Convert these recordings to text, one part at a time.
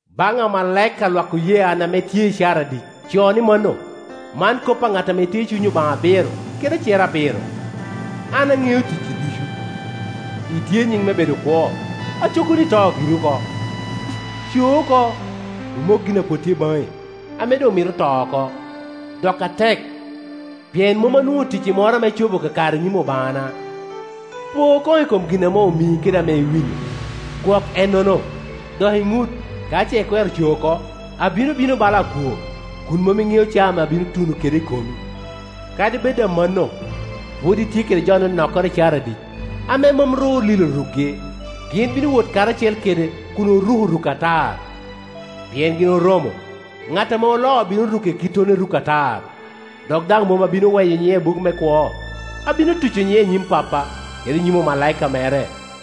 “Baŋ amalaika a lwak oye an ame tye i Caradic co ni mano: “Man kop a ŋat ame tye i cuny Obaŋa abiro, kede acer abiro. “‘An aŋeo ticci ducu; itye i nyin me bedo kwo, aco kono ito giri oko. Co oko, imok gin a pwod tye baŋi, ame doŋ mito to oko, dok atek; pien mom anwoŋo ticci moro ame icobo kakare i nyim Obaŋana. Po koŋ i kom gin ame omii kede ame iwinyo; gwok ennono, dok iŋut. Ka ce ikwero co oko, abino bino bala akwo, kun mom iŋeo caa ame abino tuno kede i komi. Kadi bed amanno, pwod itye kede jo anonokkoro i Caradic, ame mom ru olilo rukgi. Gin bino wot karacel kede kun oruko ruk atar, pien gin oromo. Ŋat ame oloo obino ruke kittono i ruk atar, dok daŋ mom abino weyo nyiŋe i buk me kwo. Abino tuco nyiŋe i nyim Pappa, kede i nyim omalaika mere.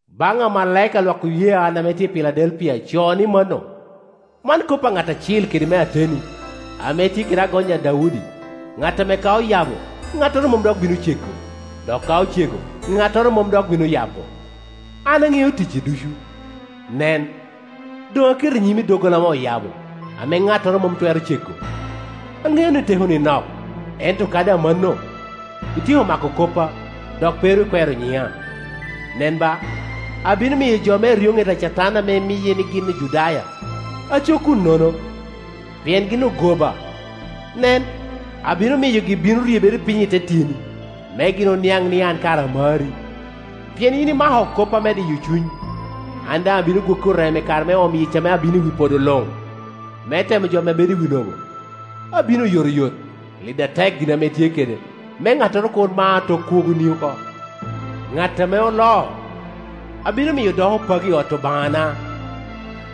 “Ban amalaika a lwak oye an ame tye i Piladelpia co ni mano: “Man kop a ŋat acil kede me ateni, ame tye kede agony a Daudi, ŋat ame ka oyabo, ŋattoro mom dok bino cego, dok ka ocego, ŋattoro mom dok bino yabo. “An aŋeo ticci ducu. Nen, doŋ aketo i nyimi doggola ame oyabo, ame ŋattoro mom twero cego. Aŋeo ni tekoni nok, ento kadi amanno, ityeko mako koppa, dok pe ru ikwero nyiŋa. Nen ba, abino miyo jo me eryoŋet a Catan ame miye ni gin Ojudaya, aco kun nono, pien gin ogoba, nen, abino miyogi bino ryebere piny i te tyeni, me gin oniaŋ ni an kara amari. Pien yin imako koppa me diyo cuny, an daŋ abino gwoki oreme i kare me omo yic ame abino i wi podo luŋ, me temo jo ame bedo i wi lobo. Abino oyotoyot. Lid atek gin ame itye kede, me ŋattoro kur ma tok kwogoni oko. Ŋat ame oloo, abino miyo doko pagi i ot Obaŋana,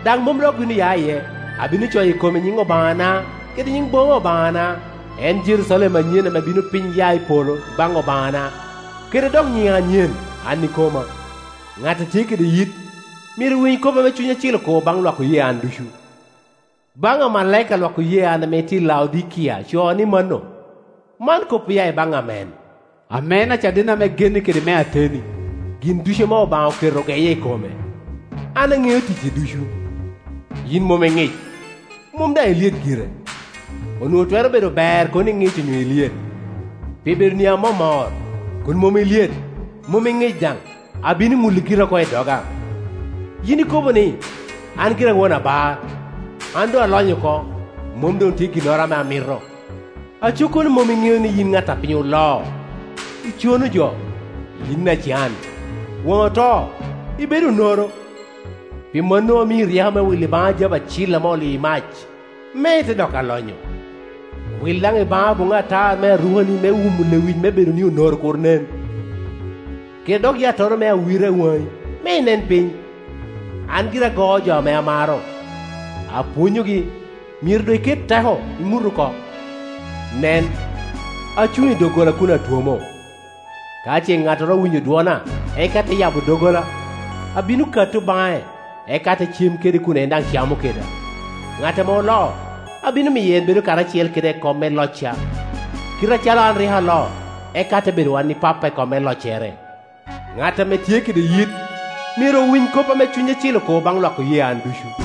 daŋ mom dok bino ya iye. Abino coyo i kome nyiŋ Obaŋana, kede nyiŋ boma Obaŋana, en Jerucalem anyen ame bino piny ya i polo i baŋ Obaŋana kede dok nyiŋa anyen an ikoma. Ŋat a tye kede yit, myero owiny kop ame Cuny Acil okobo baŋ lwak oye an ducu. “Baŋ amalaika a lwak oye an ame tye i Laodikia co ni mano: “Man kop oya i baŋ Amen, ame en acaden ame genne kede me ateni, gin ducu ame Obaŋa oketo ogeye i kome. “ ‘An aŋeo ticci ducu. Yin mom iŋic, mom daŋ ilyet gire. Onwoŋo twero bedo ber kono iŋic onyo ilyet. Pi bedoni amomor, kun mom ilyet, mom iŋic daŋ, abino ŋuli gira oko i doga. Yin ikobo ni, “An gira a won abar, an doŋ alony oko, mom doŋ tye ginnoro ame amito.” Aco kono mom iŋeo ni yin ŋat ame piny oloo, icono jo, yin acan, waŋi oto, ibedo onoro. Pi mano amii ryeko me wilo i baŋa jabu acil ame olio i mac, me ite doko alonyo. Wil daŋ i baŋa boŋŋi atar me arukani me wumo lewic me bedoni onoro kur nen, kede dok yattoro me awira i waŋi, me inen piny. An gira agoo jo ame amaro, apwonyogi; myero doŋ iket teko, iŋut oko. Nen, acuŋ i dogolla kun atwomo. Ka ce ŋattoro owinyo dwona, eka te yabo doggola, abino katto baŋe, eka ate cem kede kun en daŋ camo keda. Ŋat ame oloo, abino miyo en bedo karacel kade i kom me locca, kite acalo an rik aloo, eka ate bedo wan i Pappa i kom me loccere. Ŋat ame tye kede yit, myero owiny kop ame Cuny Acil okobo baŋ lwak oye an ducu.’”